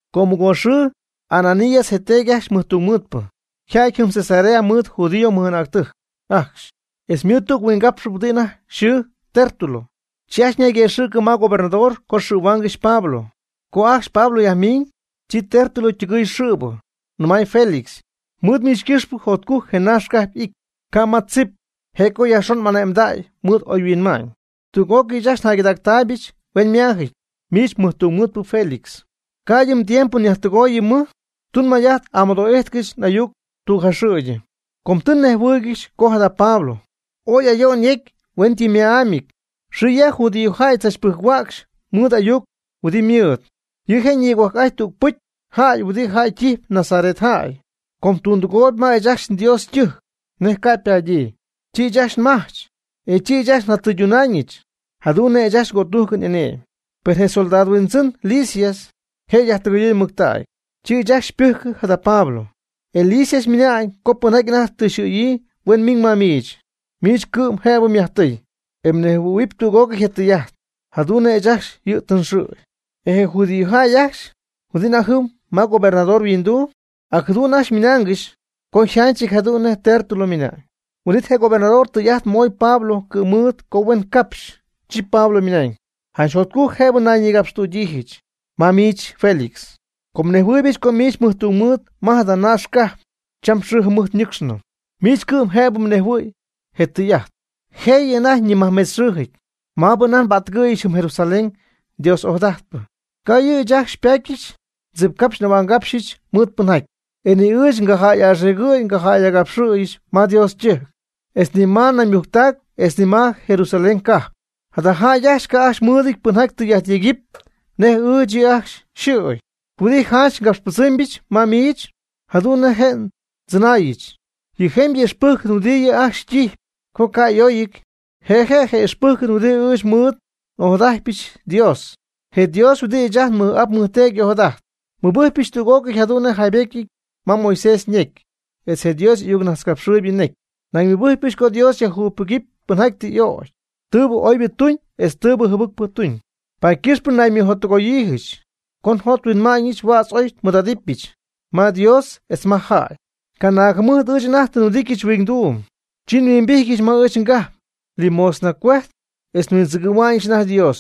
Co mɨgoox xɨɨ Ananías je teedy ajcxy ymɨjtungmɨɨdpɨ yja'ty jɨm Cesarea mɨɨd judío mɨj'anäctɨjc ajcxy etz mɨɨd tüg huingapxpɨ huɨdi anajty yxɨɨ Tértulo, chi ajcxy ñayguëxɨ̈cɨ ma gobernador co xɨ̈huaangɨxy Pablo. Co ajcxy Pablo yajmiñ, chi Tértulo ytɨgɨɨy xɨ̈bɨ, nɨmay Félix: ―Mɨɨd miich ycɨxpɨ jotcujc je naaxcajp y'ijty, ca' ma tzip, je' co yajxon m'ane'mdäy mɨɨd oyhuinma'ñ. Tüg'ócɨy ɨɨch ajcxy njäygɨdacpyɨch hueñyma'ámyɨty, miich mɨjtungmɨɨdpɨ Félix. Ca'ydɨ mdiempo nyajtɨgooyɨ mɨj, tun may'ajt amɨdo'íjtɨgɨch n'ayuc tüg jaxɨ̈gyɨ. Com tɨ nnejhuɨ́ɨygɨxɨch co jada Pablo, ooy ayo'n yecy hueñytɨmma'ámyɨty. Xɨ ya judíojäy tzach pɨjc-huäcxy mɨɨd y'ayuc huɨdi ymɨɨd. Yɨ' je' nigohuajc'ajtp tüg pɨcy jäy huɨdi jäy ytijpy Nazaret jäy. Com tundɨgoy ma ɨɨch ajcxy nDios ytɨjc nej ca' ypadyii, chi ɨɨch ajcxy nmajch, e chi ɨɨch ajcxy njatɨydunaañɨch jadu'n nej ɨɨch ajcxy ngötújcɨn y'ane'my. Per je comandante Lisias je' yajtɨgɨyɨɨy mɨctägy, chi ɨɨch ajcxy xypɨjcɨ jada Pablo. E Lisias ymɨnañ co pɨnjaty anajty tɨ yxɨ̈yii huen miiñ ma miich. Miich cɨ'm jëbɨ myajtɨɨy, e mnejhuɨ̈huɨp tüg'ócɨy je tɨy'ajt jadu'n nej ɨɨch ajcxy yɨ' tɨ nxɨ̈y. E je judíojäy ajcxy huɨdi anajty jɨm gobernador yhuinduu, ac jadu'n ajcxy ymɨnaangɨxy co yjanchɨty jadu'n nej Tértulo ymɨna'ñ. Huin'it je gobernador tɨy'ajt moy Pablo cɨ̈mɨɨd co huen capxy, chi Pablo ymɨnañ: ―Janch jotcujc jëbɨ nayñïgapxtüdyiijɨch ma miich Félix, com nejhuɨɨybɨch co miich mɨjtungmɨɨd ma jada naax cajp cham xɨɨ jɨmɨjt ñɨcxnɨ. Miich cɨ'm jëb mnejhuɨ̈y je tɨy'ajt, jëyɨ anajty ñimajcmetzxɨɨjɨ̈y maabɨ anajty nbättɨgɨ̈yɨch jɨm Jerusalén Dios ojadajtpɨ. Ca' ɨɨch yɨ' ajcxy xypaty ndzipcapxy n'ahua'ngapxyɨch mɨɨd pɨnjaty. E ni ɨɨch ngajäy'axiigɨ̈y ngajäy'agapxɨ̈y ma Dios ytɨjc, etz ni ma naymujctac etz ni ma Jerusalén cajp. Jada jäy ajcxy ca' ajcxy mɨɨdɨty pɨnjaty tɨy'ajt yegɨpy nej ɨɨch yɨ' ajcxy yxɨ̈y. Huɨdi janch ngapxypɨdzɨɨmybɨch ma miich jadu'n nej je tzɨnaayɨn, je jemybɨ ixpɨjcɨn huɨdibɨ yɨ' ajcxy ytijpy ca' y'óyɨty, je' je' je ixpɨjcɨn huɨdi ɨɨch mɨɨd n'ojadajtpɨch Dios, je Dios huɨdi ɨɨch ajcxy nmɨj'ap nmɨjteedy y'ojadajt. Nmɨbɨjcpyɨch tüg'ócɨy jadu'n nej yjaybetyɨty ma Moisés ñecy, etz je Dios y'ayucnajtzcapxɨɨybɨ ñecy. Nañ nmɨbɨjcpɨch co Dios yajjugypɨgɨpy pɨnjaty tɨ y'ögy, tɨɨbɨ oybɨ tuñ etz tɨɨbɨ jɨbɨcpɨ tuñ. Paady ycɨxpɨ naymɨjottɨgoyiijɨch co njothuinma'ñɨch huädz ooy nmɨɨd'idɨpyɨch ma Dios etz ma jäy. Canaag jɨmɨjt ɨɨch anajty tɨ nhuɨdityɨch huingduum, chi nhuimbijtyɨch ma ɨɨch ngajp limosna cuejtp etz nhuindzɨgɨ̈hua'ñɨch anajty Dios.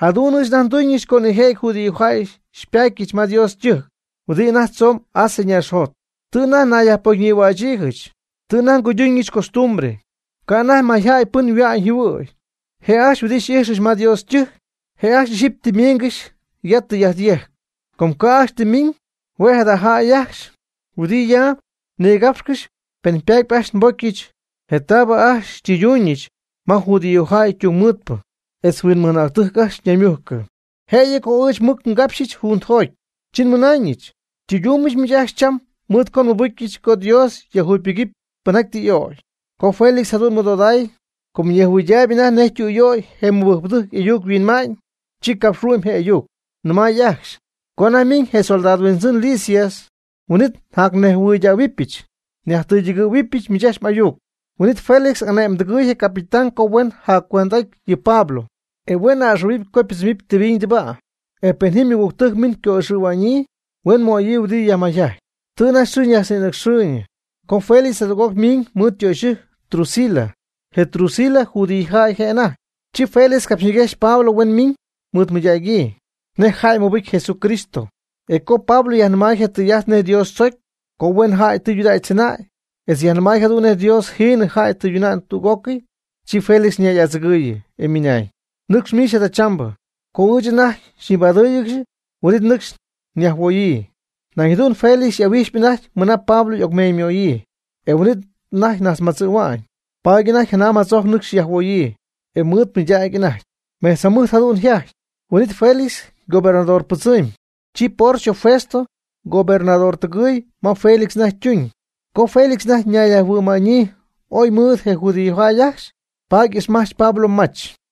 Jadu'n ɨɨch anajty nduñ co nijëjɨty judíojäy xypatyɨch ma Dios ytɨjc huɨdi anajty tzoomb Asia ñaaxjot. Tɨ anajty naybocyñïhuächyiijɨch, tɨ anajty nguyduñɨch costumbre, ca' anajty mayjäy pɨn yhua'ñ yjɨhuɨ̈y. Je jäy ajcxy huɨdi xy'ijxyɨch ma Dios ytɨjc, je' ajcxy ixyipy tɨ ymiingɨxy ya tɨy'ajt yejcp. Co ca' ajcxy tɨ miiñ, huen jada jäy ajcxy huɨdi ya nigapxcɨxy pen ypaat ajcxy nbocyɨch je taabɨ ajcxy xytɨyduñɨch ma judío jäy tungmɨɨdpɨ etz huinmɨj'anäctɨjc ajcxy ñaymujcɨ. Jëyɨ co ɨɨch mɨc ngapxyɨch juntɨjoty, chi nmɨnaañɨch: “Xytɨydumbɨch miich ajcxy cham mɨɨd co nmɨbɨcyɨch co Dios yajjugypɨgɨpy pɨnjaty tɨ y'o'cy.” Co Félix jadu'n mɨdodaay, com ñejhuɨydaayb anajty nej tüyöy je mɨbɨjcpɨdɨjc y'ayuc yhuinma'ñ, chi capxhuɨ'my je ayuc, nɨmay ajcxy: ―Co anajty miiñ je comandante Lisias, huin'it njacnejhuɨydähuɨbɨch nyajtɨydɨgɨ̈huɨbɨch miich ajcxy m'ayuc. Huin'it Félix ane'mdɨɨy je capitán co huen yajcuend'aty yɨ Pablo, e huen a'ɨxɨ̈huɨp co pɨdzɨm tɨbiñ tɨbäy e pen ji ymɨgügtɨjc miiñ co'ixɨ̈huäñyii, huen möyii huɨdi yajmayjajtpy. Tɨ anajty xɨɨ ñajtznïnɨcxɨɨyñɨ co Félix jadüg'oc miiñ mɨɨd ytöxyɨjc Drusila. Je Drusila judíojäy je' anajty. Chi Félix capxyñiguejxy Pablo huen miiñ mɨɨdmɨydägyii nej jäy mɨbɨcy Jesucristo. E co Pablo yajnɨmay je tɨy'ajt nej Dios tzocy co huen jäy tudägy tzɨnäy, etz yajnɨmay jadu'n nej Dios jiinɨ jäy tɨyduna'ñ tüg'ócɨy, chi Félix ñay'adzɨgɨɨyɨ, ymɨnañ: ―Nɨcx miich jadachambɨ, co ɨɨch anajty xyñibadɨ́ɨyɨgɨxy huin'it nɨcxy nyajhuooyii. Nañ jadu'n Félix y'ahuijxpy anajty mɨna Pablo y'ocmeeñymöyii, e huin'it anajty najtzmadzɨ̈hua'ñ. Paady anajty janam jadzojc nɨcxy yajhuoyii, e mɨɨd mɨydägy anajty. Mejtz jɨmɨjt jadu'n yjajty, huin'it Félix ygobernadorbɨdzɨmy. Chi Porcio Festo ygobernadortɨgɨɨy ma Félix anajty ytuñ. Co Félix anajty nayyajhuɨ'ma'ñyii ooy mɨɨd je judíojäy ajcxy, paady ixmajch Pablo mach.